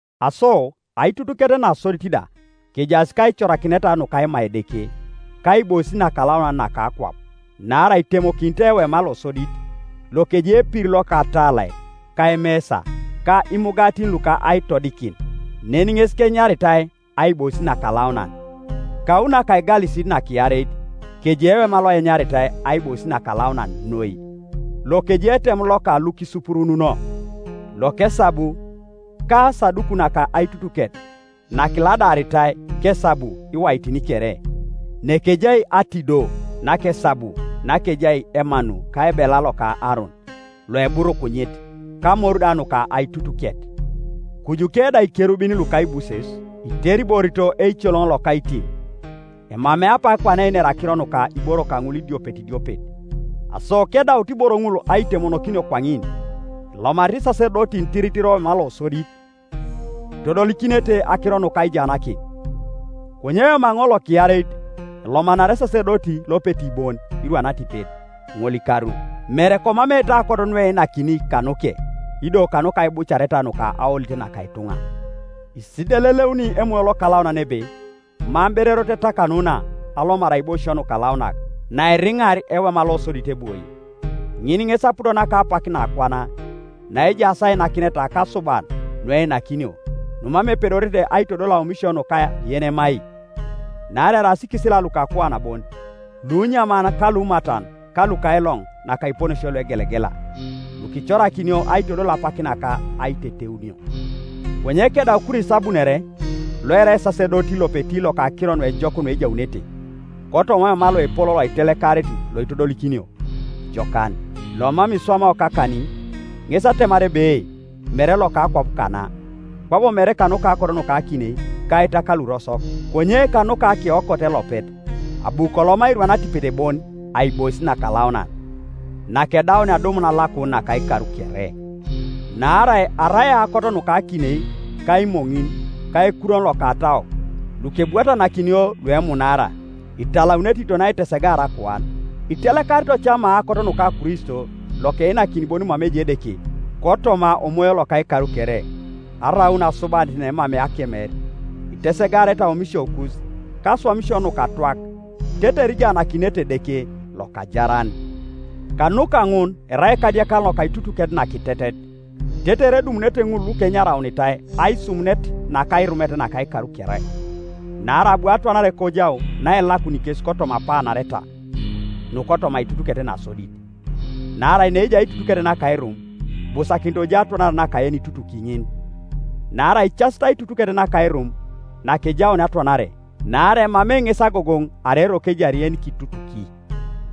Aso aitutuket nasodit da kejaas kaicorakineta nuka aima Edeke ka aibois nakalaunan naka akwap. Naarai itemokinitoi ewema losodit, lokejai epir loka atalai, ka emesa, ka imugatin luka aitodikin, nen ŋes kenyaritai Aibois nakalaunan. Kau naka aigalisit nakiareit kejai ewema lokenyaritai Aibois nakalaunan noi, lokejai etem loka lukisupurununo lokesabu, ka asaduku naka aitutuket nakiladaaritai kesabu iwaitin kere, nekejai atido nakesabu nakejai emanu, ka ebela loka Aaron loeburukunyit, ka amor da nuka aitutuket; kujuke da Ikerubin luka aibuses, iteriborito eicoloŋ-lokaitim. Emamei apak kwana einer akiro nuka iboro kaŋul idiopet idiopet. Aso kedaut iboro ŋul aitemonokinio kwaŋin, elomanarete isasedotin tiritir owema losodit, itodolikinete akiro nuka aijaanakin; konye owema ŋol lokiareit elomanari esasedoti lopeti bon, irwan atipet ŋolikaru, mere komameete aokot nueinakini kanuke, ido kanuka aibucareta nuka aolit naka ituŋa. Isideleleuni Emoyo Lokalaunan ebe mam ber erot etakanuna alomar aiboisio nukalaunak, naeriŋar ewema losodit ebwoi. Ŋin ŋes aput naka apak nakwana, naejaas ainakineta ka asuban nueinakinio numam epedorete aitodol aomisio nuka yenemai; naarai eraas ikisila luka akuan bon, lunyaman ka lumatan, ka luka ailoŋ naka iponesio luegelegela, lukicorakinio aitodol apak naka aiteteunio. Konye kedau Kristo abunore, loerai esasedoti lopeti loka akiro nuejok nuejaunete, kotoma owema loepol aitelekarit loitodolikinio jokan, lomam kiswamao kakanin, ŋes atemar ebe, mere loka akwap kana, kwabo mere kanuka aokot nuka akinei ka itak lurosok, konye kanuka akeokot elopet, abu koloma irwan atipet bon Aibois Nakalaunan, nakedaunia adumun alakun naka ikar kere. Naarai arai aokot nuka akinei ka imoŋin, ka ekurwon loka ataok, lukebwatanakinio luemunaara, italaunete kiton aitesegaar akuan, itelekarito cama aokot nuka Kristo, lokeinakin bon mama ejai Edeke kotoma Omoyo loka ikar kere, araun asubanit naemamei akemer, itesegarete aomisiokus kaswamisio nukatwak tetere ijaanakinete Edeke lokajaran. Kanuka ŋun erai ekadiekan loka aitutuket nakitetet, tetere edumunete ŋul lukenyaraunitai aisumunet naka airumet naka ikar kere, naarai abu atwanare kojau naelakuni kes kotoma apaanareta nukotoma aitutuket nasodit. Naarai neejai aitutuket naka airum, ibusakinit kojai atwanare naka yenikitutuki ŋin. Naarai icasit aitutuket naka airum nakejaunia atwanare, naarai emamei ŋes agogoŋ arai eroko ejari yenikitutuki.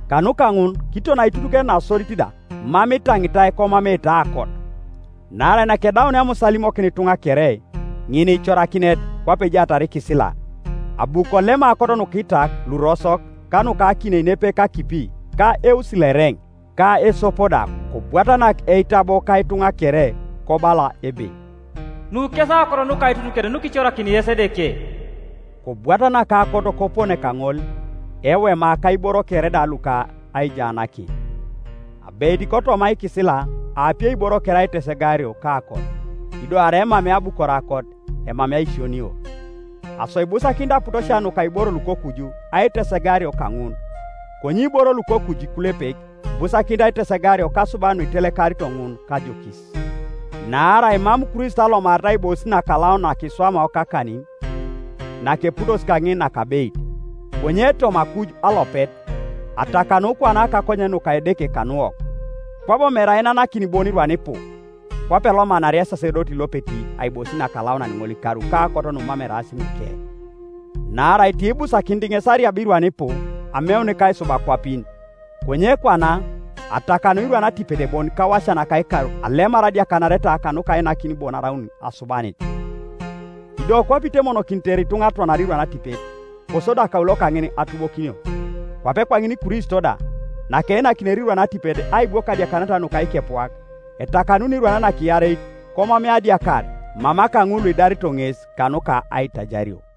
Kanuka ŋun kiton aitutuket nasodit da mam itaŋitai komameete aokot. Naarai nakedaunia Musa alimokin ituŋa kere ninikicorakinet kwape ejaatar ikisila, abu kolem aokot nuka itak lurosok ka nuka akinei nepepe kakipi ka eusi loereŋ, ka esop da, kobwatanak eitabo ka ituŋa kere, kobala ebe, “Nu kes aokot nuka aitutuket nukiicorakini yes Edeke,” kobwatanak aokot kopone kaŋol ewema, ka iboro kere da luka aijaanakin. Abeit kotoma ikisila aapiei iboro kere aitesegario kaokot, ido arai emamei abukor aokot emamei aisionio. Aso ibusakinit aputosia nuka iboro lukokuju aitesegario kaŋun, konye iboro lukokuju ikulepek ibusakinit aitesegario kasuban nuitelekarito ŋun kajokis. Naarai mam Kristo alomarit aibois nakalaunan nakiswamao kakanin, nakeputosi kaŋin kanakabeit, konye toma akuj alopet, atakanu kwana kakonyen nuka Edeke kanuwok. Kwabo mere ainanakin bon irwan ipu, kwape elomanaria esasedoti lopeti Aibois Nakalaunan ŋolikaru kaokot numam eraas nuke; naarai tiibusakinit ŋes arieb irwan ipu ameun kaisub akwapin. Konye kwana, atakanu irwan atipet bon kawasia naka ikar alemar adiakanareta kanuka ainakin bon araut asubanit. Ido kwape itemokinitere ituŋa atwanare irwan atipet, kosodi akaulo kaŋin atubokinio, kwape kwaŋin Kristo da, nakeinakinere irwan atipet aibwok adiakanareta nuka ikepuak, etakanuni irwan nakiareit komamei adiakar mama kaŋul luidareto ŋes kanuka aitajario,